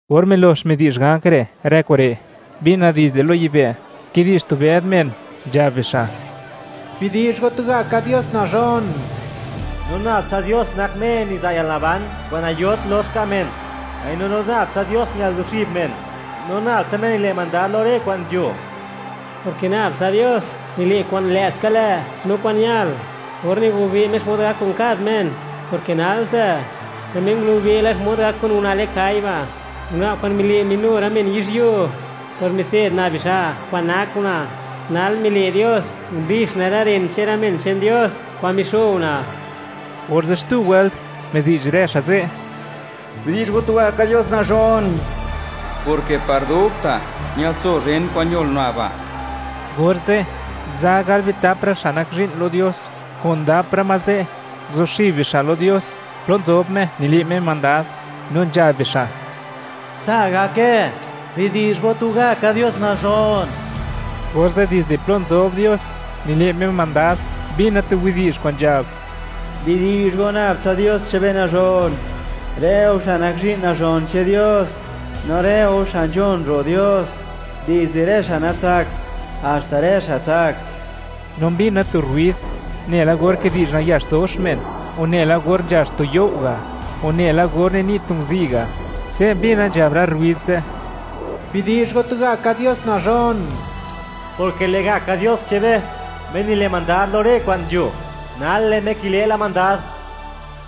Or milox midi'zh ganj re' rë kure', mbina dizde lo yibë', kidi'zh tu bëd men, nzhab bixa': ¡Bidi'zh go tugaka Dios nazhon! No nab tsa Dios nak Me niza' yalnaban kwa'n nayot lox ka' men, mbaino lo nab tsa Dios ñal zuxib men. No nab tsa Me nile' mandad lo rë kwa'n nzho, porke nab tsa Dios nile' kwa'n lë'ska lë' no kwa'n ñal, or nigobe' Me xmod gak kun kad men, porke nalse, lë' Me ngulube' la xmod gak kun una' le'n kai (kwa' gal) ba', una' kwa'n mile' minu rë men yizhyuo por mitse'd una' bixa' kwa'n nak una'. Nal mile' Dios, ndix una' rë ren che'n rë men che'n Dios, kwa'n mixo una'. Orze' xtu wëlt, midi'zh rë xa' ze': ¡Bidi'zh go tugaka Dios nazhon!, porke par dubta', ñatso zhen kwa'n ñol una' ba'. Orze', za gal bitap rë xa' nak zhi'n lo Dios, kudap rë ma ze', nguzuxib bixa' lo Dios plo nzob Me, nile' Me mandad, no nzhab bixa': ¡Sa' gake! ¡Bidi'zh go tugaka Dios nazhon! Orze' dizde plo nzob Dios, nile' Me mandad, mbina tu widi'zh kwa'n nzhab: ¡Bidi'zh go nab tsa Dios che'n be nazhon; rë go xa' nak zhi'n nazhon che'n Dios, no rë go xa' nzhon ro' Dios, dizde rë xa' natsakt, haxta rë xa' tsak! No mbina tu rruid, nela or kidi'zh nayax dox men, o nela or nzhax tu you' ga', o nela or nini' tu nguzi' ga'; se' mbina nzhab rë rruid ze': ¡Bidi'zh go, tugaka Dios nazhon!, porke lë'gaka Dios che'n be, Me nile' mandad lo rë kwa'n nzho, nal, lë' Me kile' la mandad.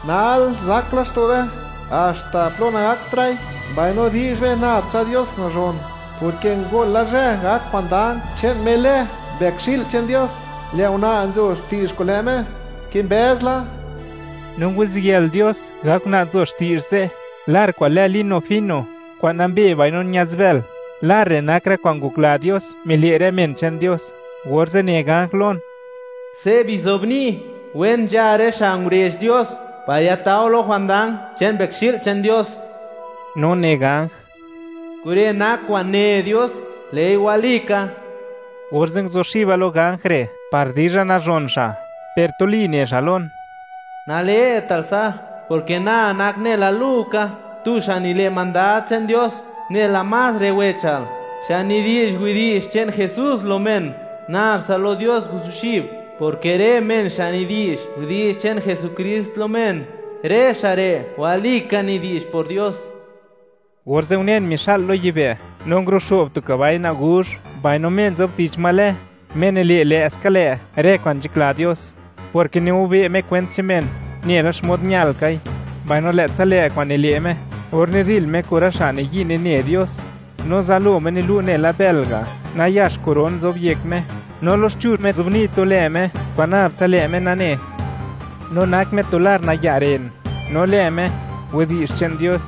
¡Nal, zak laxto' be, haxta plo nagaktra'i, mbaino di'zh be nab tsa Dios nazhon!, porke ngol la zhë gak jwandang che'n Me lë Mbëkxi'l che'n Dios. Lë' Una' nzo xti'zh kun lë' Me, kimbëz la. No nguziyël Dios, gak Una' nzo xti'zh ze', lar kwa'n lë lino fino, kwa'n nambe, mbaino ña'zbël. Lar re' nak rë kwa'n ngokla Dios, mile' rë men che'n Dios. Orze' ne ganj lon: ―Se' bizobni': “Wen nzha rë xa' ngurezh Dios, par yatao lo jwandang che'n Mbëkxi'l che'n Dios.” No ne ganj: ―Kure' nak kwa'n ne Dios, lë'i walika. Orze' nguzuxiba lo ganj re' par dizha nazhon xa', per tuli ne xa' lon: ―¡Nale'tal sa'!, porke na nak nela lu ka; tu xa' nile' mandad che'n Dios, nela más rë wechal, xa' nidi'zh widi'zh che'n Jesús lo men. Nabtsa lo Dios guzuxib; porke rë men xa' nidi'zh widi'zh che'n Jesukrist lo men, rë xa' re' walika nidi'zh por Dios. Orze' unen, mixa'l lo yibë', no nguruxo'b tu kabai naguzh, mbaino Me nzob tich ma lë: “Me nile' lë'ska lë' rë kwa'n nzhakla Dios”, porke nigobe' Me kwent che'n men nela xmod ñalkai, mbaino lë'tsa lë' kwa'n nile' Me or nidil Me kun rë xa' niyi' nine Dios. No zalo Me nilu' nela bël ga', nayax koron nzob yek Me, no loxchuzh Me nzobni' lë Me kwa'n nab tsa lë' Me nane, no nak Me tu lar naya' ren, no lë Me: “Widi'zh che'n Dios.”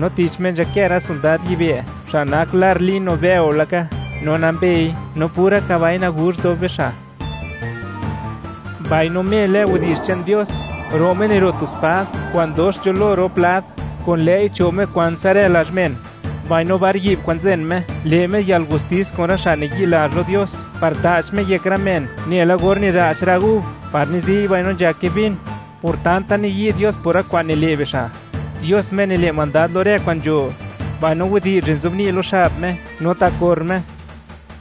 No tich Me nzhakë rë sondad yibë', xa' nak lar lino bëo laka no nambei, no pura kabai naguzh nzob bixa'. Mbaino, Me lë Widi'zh che'n Dios, ro' Me niro' tu spad kwa'n dox nzho lo rop lad; kun lë'i, cho' Me kwantsa rë lazh men; mbaino bar yi'b kwa'n nzen Me, le' Me yalgustis kun rë xa' nayi'lazh lo Dios, par ta'ch Me yek rë men nela or nida'ch rë gub par nizi'y no nzhake vin, por tanta niyi' Dios por rë kwa'n nile' bixa', Dios Me nile' mandad lo rë kwa'n nzho. Mbaino widi'zh re' nzobni' lo xab Me no ta' kor Me: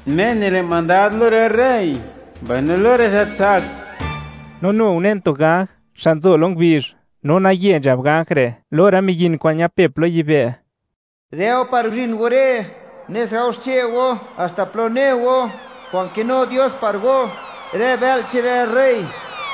“Me nile' mandad lo rë rey mbaino lo rë xa' tsak.” No nu unen tu ganj xa' nzo lo ngubizh, no naye nzhab ganj re' lo rë miyin kwa'n ñapep lo yibë': ―Dë' go par guzhin go re', nes gao xche' go haxta plo ne go, kwa'n kinu Dios par go; rë bë'l che'n rë rey,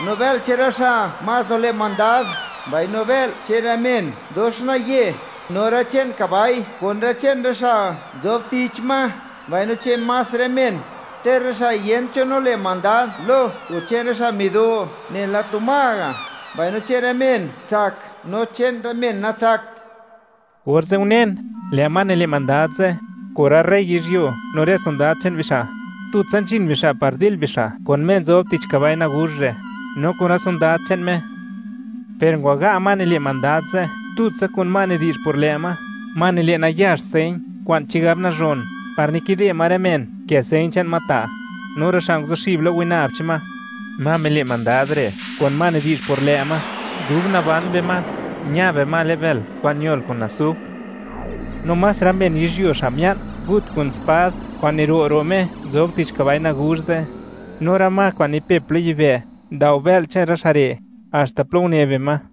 no bë'l che'n rë xa' más nile' mandad, mbaino bë'l che'n rë men dox naye, no rë che'n kabai kun rë che'n rë xa' nzob tich ma, mbaino che'n más rë men, ter rë xa' yent cho nile' mandad lo o che'n rë xa' mido nela tu ma ga', mbaino che'n rë men tsak no che'n rë men natsakt. Orze' unen, lë' ma nile' mandad ze', kun rë rey yizhyuo, no rë sondad che'n bixa'; tutsa nzhin bixa' par dil bixa' kun Me nzob tich kabai naguzh re', no kun rë sondad che'n Me. Per ngwaga' ma nile' mandad ze' tutsa kun ma nidi'zh por lë' ma, ma nile' nayax señ kwa'n chigab nazhon, par nikide ma rë men nkë señ che'n ma ta', no rë xa' nguzuxib lo winab che'n ma. Ma mile' mandad re' kun ma nidi'zh por lë' ma, dub naban bima ña bima le'n bël kwa'n ñol kun asufr. No más rë men yizhyuo xa' mia'n, ngut kun spad kwa'n niro' ro' Me nzob tich kabai naguzh ze', no rë ma kwa'n nipep lo yibë', ndao bë'l che'n rë xa' re', haxta plo une bima.